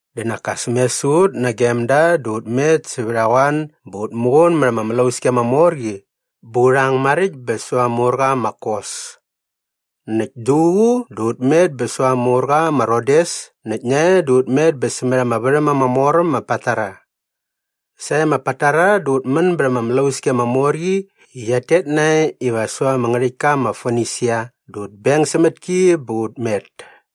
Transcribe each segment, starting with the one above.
Dä nak as me sä ut nagem da dä ut met sävät a qoan bä ut muqun mät ama mlauski ama mor qi bä u rhang maräkt bä säva ama urqa ma Kos. Näkt duququ dä ut met bä säva ama urqa ma Rodes näkt nae dä ut met bä sämät ama värhäm ama mor äm ma Patara. Sae ma Patara dä ut män bät ama mlauski ama mor qi i qiat tet nae iva säva ama ngärhäktka ma Fonisia dä ut beng sämät ki bä ut met.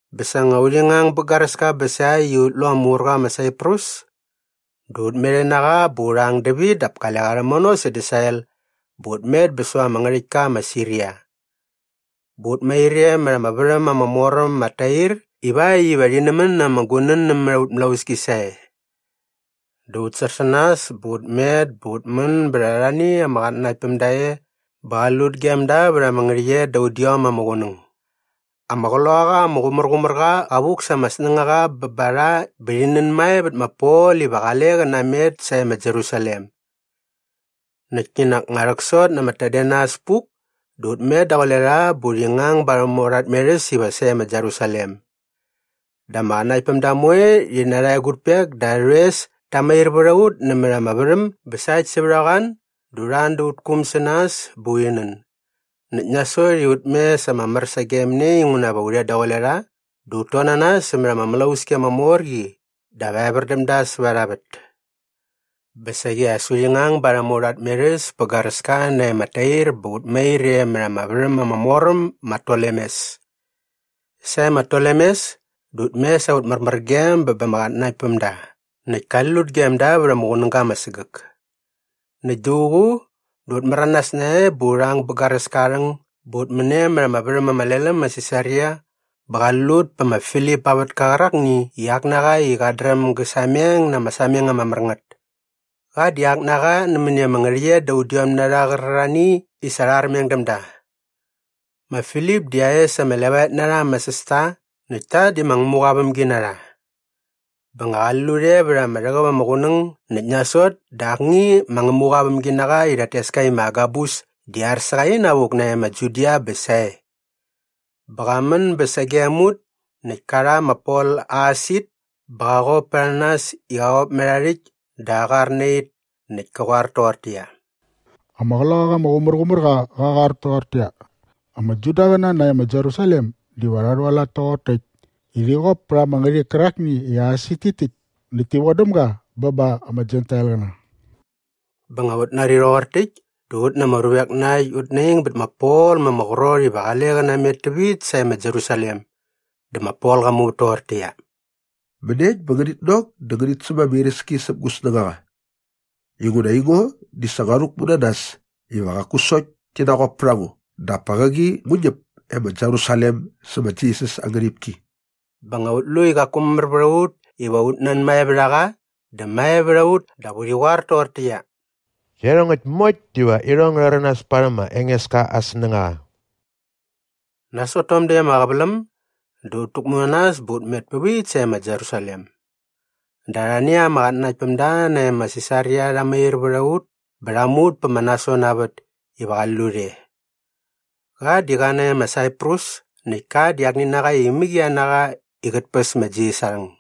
Bä sa nga urhi ngang bä garäska bä sa äkt i ut lu ama urqa ma Saiprus dä ut met e na qa bä u rhang dävit dap kale qa rhämono sädä sael bä ut met bä säva ama ngärhäktka ma Siria. Bä ut mair e mät ama värhäm ama mor äm ma Tair ivakt iva rhi nämän na ama gunän nämät aut mlauski sae. Dä ut sär sä nas bä ut met bä ut män bät arhani ama qatnanaktpämda e bä qali lut gem da vät ama ngärhäqyet da udiom ama qunäng. Ama Qloqaqa ama Qumärqumärqa qa vuk sa ama snängaqa bä ba rha bä rhi nänmae vät ma Pol iva qale qä namet sae ma Jerusalem. Näkt kinak nga rhäksot na ama tadenas puk dä ut met daqule rha bä urhi ngang barhäm aurha tmerhäs iva sae ma Jerusalem. Dä ama qatnanaktpämda moe rhi na arha egutpek dä arhä rhoes ta mair vät a ut nämät ama värhäm bä sa äkt sävät a qoan dä urha an da aut kuum sä nas bä urhi nän. Näkt nasot i ut mes ama mär sagem ne inguna va u rhet daqule rha dä ut ton na nas sämät ama mlauski ama mor qi dap evär däm da säva arha vät. Bä saqi as urhi ngang barhäm aurha tmerhäs pä garäska nae ma Tair bä ut mair e mät ama värhäm ama mor äm ma Tolemes. Sae ma Tolemes dä ut mes aut märmärgem bä ba ama qatnanaktpämda näkt kali lut gem da vät ama qunäga ama sägäk. Näkt duququ dä ut märanas nae bä u rhang bä garäska aa rhäng bä ut män e mät ama värhäm ama lel äm ma Sisaria bä qali lut pä ma Filip aa vätka qärakni i ak na qa i qat dräm gä sameng na ama sameng ama mär ngät. Qa di ak na qa nämäni ama ngärhäqyet da udiom na rha qärarhani i sa rha armeng däm da. Ma Filip di aa es ama evop ama levaet na rha ama sästa näkt ta di ma Ngämuqa aa vämginarha. Bä ngä qali lut e vät ama rhäqäp ama qunäng näkt nasot dä akni ma Ngämuqa aa vämginaqa i rhat tes ka i ma Agabus di ar sä qa inavuk nae ma Judia bä sae. Bä qa män bä sagem ut näkt ka rha ma Pol aa aasit bä qa qop pät a nas i qa qop mät aa rhäkt dä aa qar na it näkt kä qoar toqortäqyia, “Ama Qloqaqa ama Qumärqumärqa qa qoar toqortäqyia, ‘Ama Judaqäna nae ma Jerusalem diva rha rhualat toqor täkt i rhi qop pät ama ngärhik kärakni i aa aasit tit täkt näkt ti vodäm ga bä ba ama Jentailqäna.’” Bä nga ut nari rhoqor täkt dä ut na ama ruvek na äkt ut naing bät ma Pol ma ama qrot iva qale qä namet tävit sae ma Jerusalem. Dä ma Pol qa muvät toqortäqyia, “Mäniekt bä ngänit nok dä ngänit säm ama iräski säp gu snängaqa? Inguna aingo di sa ngua rhäkmu na nas iva qaku sokt ti naqop pät a ngo dap pa qäqi ngu ñäp e ma Jerusalem sä ma Jisas aa ngärhipki.” Bä nga ut lu i qaku mamär vät a ut iva ut nanmae vät a qa dä mae vät a ut dap urhi qoar toqortäqyia, “Iarhongäkt moekt diva irhong ngä rhäranas parhäm ma Engeska aa snängaqa.” Nasot tom däkt ama qäväläm dä ut täkmu na nas bä ut met pävit sae ma Jerusalem. Dä arhani ama qatnanaktpämda nae ma Sisaria rha mair vät a ut bä rha mu ut pä ma Nason aa vät iva qali lut e. Qa di qa nae ma Saiprus näkt ka di akni na qa i imäqia na qa i qät päs ma Jisas aa rhang.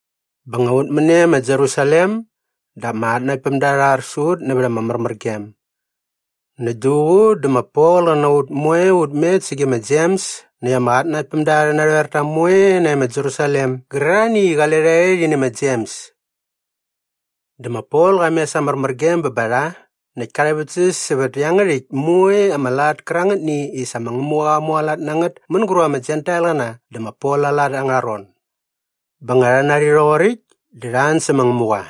Bä nga ut män e ma Jerusalem dä ama qatnanaktpämda rha ar sä ut nävät ama märmärgem. Näkt duququ dä ma Pol qä na ut moe ut met sage ma Jems näkt ama qatnanaktpämda arhä narhoerta moe nae ma Jerusalem gärarhani i qale rha e rhi nä ma Jems. Dä ma Pol qa mes aa märmärgem bä ba rha näkt ka rhäväktsäs sävät iangärhäkt moe ama lat kärangätni i sa ma Ngämuqa qa mualat na ngät mänguräp ama Jentailqäna dä ma Pol aa lat angärha ron. Bä nga rha nari rhoqoräkt dä rha an sä ma Ngämuqa.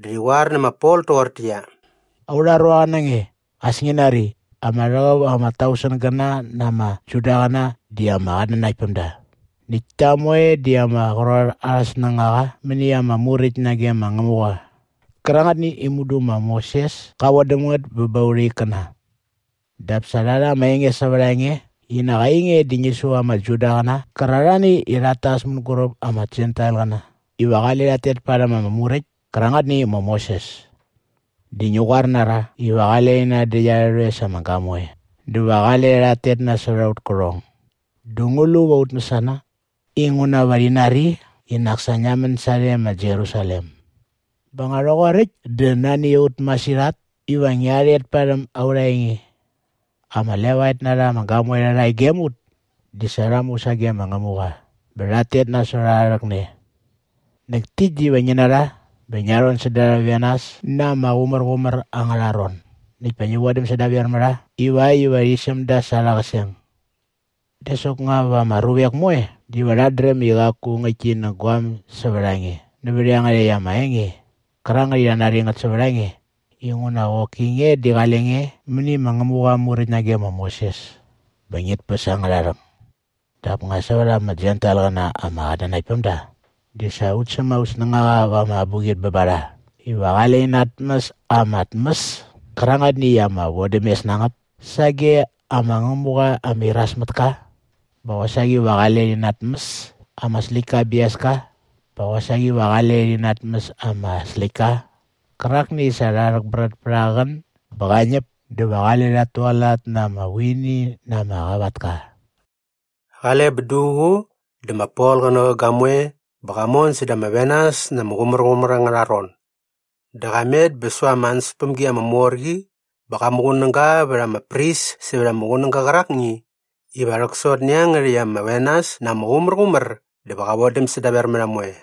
Dä rhi qoar nä ma Pol toqortäqyia, “Aurha ruaqa na nge, as ngi nari, ama rhäqäp ama tausengäna na ama Judaqäna di ama qatnanaktpämda näkt ta moe di ama qrot arhä snängaqa mäni ama Muräkt nage ma Ngämuqa qärangätni i mudu ma Moses ka vodäm ngät bä ba aurha ikkäna. Dap sa rha rha ama enge sävät a nge i nak ainge di ngi su ama Judaqäna qärarhani i rhat tas mänguräp ama Jentailqäna iva qale rhat tet parhäm ama Muräkt kärangätni i ma Moses. Dä ngi qoar na rha iva qale rhi nändäkt arhä rhoes ama gamoe dä va qale rhat tet nasot aut kärhong. “Dä ngu lu va ut mäsana? Inguna va rhi nari i nak sa ngia män sarhe ma Jerusalem. Bä nga rhoqoräkt dä nani a ut masirhat iva ngia rhet parhäm aurha enge. Ama levaet na rha ama gamoe rhärha e gem ut di sa rha mu sage ma Ngämuqa bä rhat tet nasot aa rhäkne. Näkt täkt diva ngi na rha bä ngia rhon säda arhä venas na ama qumärqumär angärha ron näkt pa ngi vodäm sädaver mä rha ivakt iva rhi säm da sa arhä qäseng. Dä soknga va ama ruvek moe diva rhat dräm i qaku ngäktki nä guaäm sävät a nge nävät iangärhäkt ama enge qärangät i rhat nari ngät sävät a nge inguna qoki nge di qale nge mäni ma Ngämuqa aa Muräkt nage ma Moses bä ngit päs angärha rhäng. “Dap nga sävät ama Jentailqäna ama qatnanakt päm da di sa ut säm aut snängaqa va ama abuqit bä ba rha iva qale rhi natmäs ama tmäs kärangätni i ama vodämes na ngät sage ama ngämuqa ama iras mät ka bä qosaqi va qale rhi natmäs ama släktka aa biaska bä qosaqi va qale rhi natmäs ama släktka qärakni i sa rha rhäkbrät pät aa qän bä qa ñäp dä va qale rhat tualat na ama vuini na ama qavatka.” Qale bä duququ dä ma Pol qä nä qä gamoe bä qa mon säda ama venas na ama qumärqumär angärha ron. Dä qa met bä säva ama ansäspämgi ama mor qi bä qa muqunäga vät ama pris sävät ama qunäga qärakni iva rhäksot nä iangärhäkt ama venas na ama qumärqumär dä va qä vodäm sädaver mä rha moe.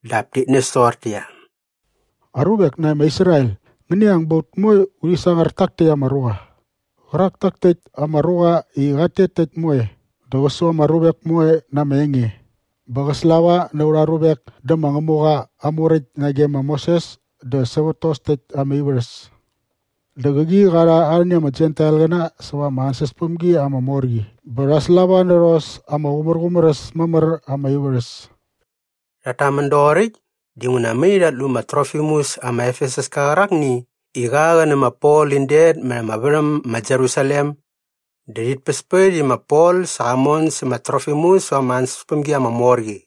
dap tit näs toqortäqyia, “Aruvek nae ma Israel, ngäni ang bä ut moe urhi sangar tak täkt ama ruqa. Qärak tak täkt ama ruqa i qat tet tä äkt moe dä qä su ama ruvek moe na ama enge bä qä slava na aurha ruvek dä ma Ngämuqa aa Muräkt nage ma Moses dä sävät tos täkt ama ivärhäs. Dä qäqi qa rha arhani ama Jentailqäna säva ama ansäspämgi ama mor qi bä rha slava nä rhos ama qumärqumär äs mamär ama ivärhäs.” Rhat tamän doqoräkt dinguna mai rhat lu ma Trofimus ama Efesuska qärakni i qa qä nä ma Pol in det mät ama värhäm ma Jerusalem dä rhit päspät i ma Pol sa qa mon sä ma Trofimus säva ama ansäspämgi ama mor qi.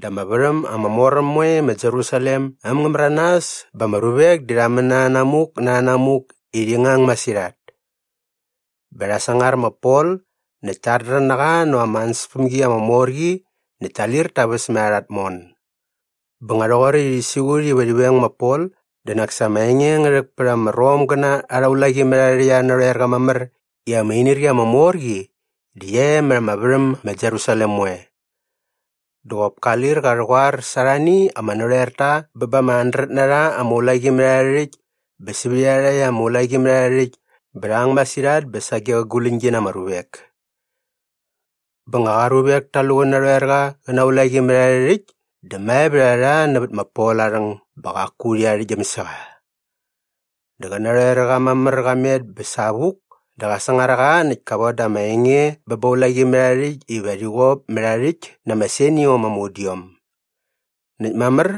Dä ama värhäm ama mor äm moe ma Jerusalem äm ngä märanas bä ama ruvek di rha män na rhänamuk na rhänamuk i rhi ngang masirhat. Bä rha sangar ma Pol näkt ta ardrän na qa näva ama ansäspämgi ama mor qi näkt ta lir ta väs mät arha tmon. Bä nga rhoqoräkt i rhi siqut iva rhi veng ma Pol dä nak sa ama enge ngä rhäk pät ama Romgäna arha ulaqimärharhärhäkt arhä narhoerqa mamär i ama inirqi ama mor qi di qia e mät ama värhäm ma Jerusalem moe. Dä qop ka lir qa rhäqoar sa arhani ama narhoerta bä ba ama handret na rha ama ulaqimärharhärhäkt bä sävät iarhakt ama ulaqimärharhärhäkt bä rha ang masirhat bä sage qä guläñgi na ama ruvek. Bä nga qa ruvek ta lu qä narhoerqa qä na aa ulaqimärharhärhäkt dä mae vät a rha nävät ma Pol aa rhäng bä qaku rhi arhäktgyäm sä qa. Dä qä narhoerqa mamär qa met bä savuk dä qa sangar a qa näkt ka voda ama enge bä ba aa ulaqimärharhärhäkt iva rhi qop mät aa rhäkt na ama seniom ama udiom. Näkt mamär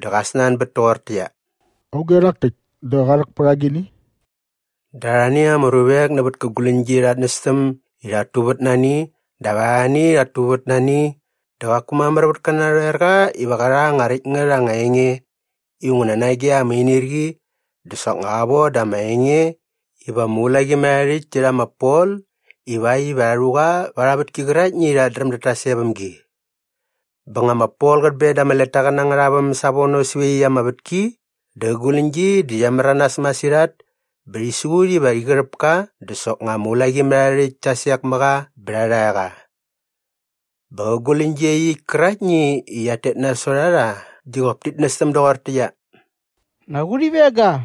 dä qa snanbät toqortäqyia, “Auge rhak täkt dä qa rhäk pät agini?” Dä arhani ama ruvek nävät kä guläñgi rha nästäm i rhat tuvät na ani dap arhani rhat tuvät na ani dä qaku mamär vät kä narhoerqa iva qä rha anga räkt ngät anga enge inguna nage ama inirqi dä soknga qa voda ama enge iva ama ulaqimärharhärhäkt ti rha ma Pol ivakt iva rha rhu qa va arha vätki qäraktni i rhat dräm dat tas e väm gi. Bä nga ma Pol qät ben da ama letaqäna angärha väm savono säva iaqyäkt ama vätki dä qä guläñgi di qia märanas masirhat bä rhi siqut iva rhi qärhäp ka dä soknga ama ulaqimärharhärhäkt ta sek mä qa bä rha rha qa. Bä qä guläñgi iaqyäkt käraktni i qiat tet nasot a rha di qop tit nästäm doqortäqyia, “Nak urhi veng ga!”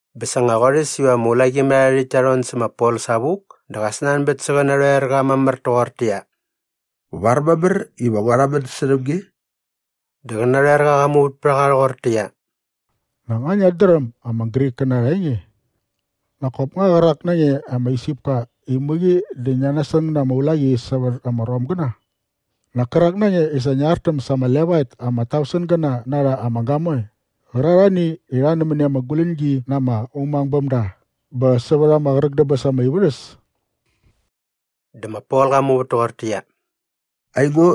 Bä sa nga qorhäs iva ama ulaqimärharhärhäkt ta rhon sä ma Pol savuk dä qa snanbät sä qä narhoerqa mamär toqortäqyia, “Var mamär iva ngua rhamän särhäm nge?” Dä qä narhoerqa qa muvät pät a qa rhoqortäqyia, “Nak nga ngiat dräm ama Grikkäna arha enge? Nak kop nga qärak na nge ama Isipka i mäqi dä ngia nasäng na ama ulaqi sävät ama Romgäna? Nak kärak na nge i sa ngia artäm sa ama levaet ama tausengäna na rha ama gamoe qärarhani i rha nämäni ama guläñgi na ama umangbämda bä sävät ama qräk dä bäs ama ivärhäs?” Dä ma Pol qa muvät toqortäqyia, “Aingo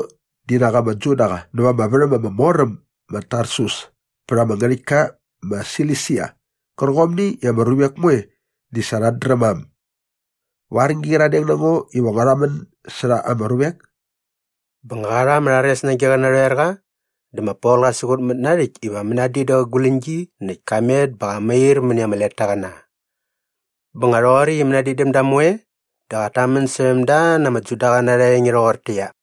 di nak ama Judaqa näva ama värhäm ama mor äm ma Tarsus pät ama ngärhäktka ma Silisia qärqomni i ama ruvek moe di sa rhat dräm ma äm. Var ngi qyiradeng na ngo iva ngua rhamän särha ama ruvek?” Bä nga qa rha ama rhares nage qä narhoerqa dä ma Pol qa siqutmät na aa rhäkt iva mänadin dä qä guläñgi näkt ka met bä qa mair mäni ama letaqäna. Bä nga rhoqoräkt i mänadin däm da moe dä qat tamän särhäm da na ama Judaqäna arha enge rhoqortäqyia,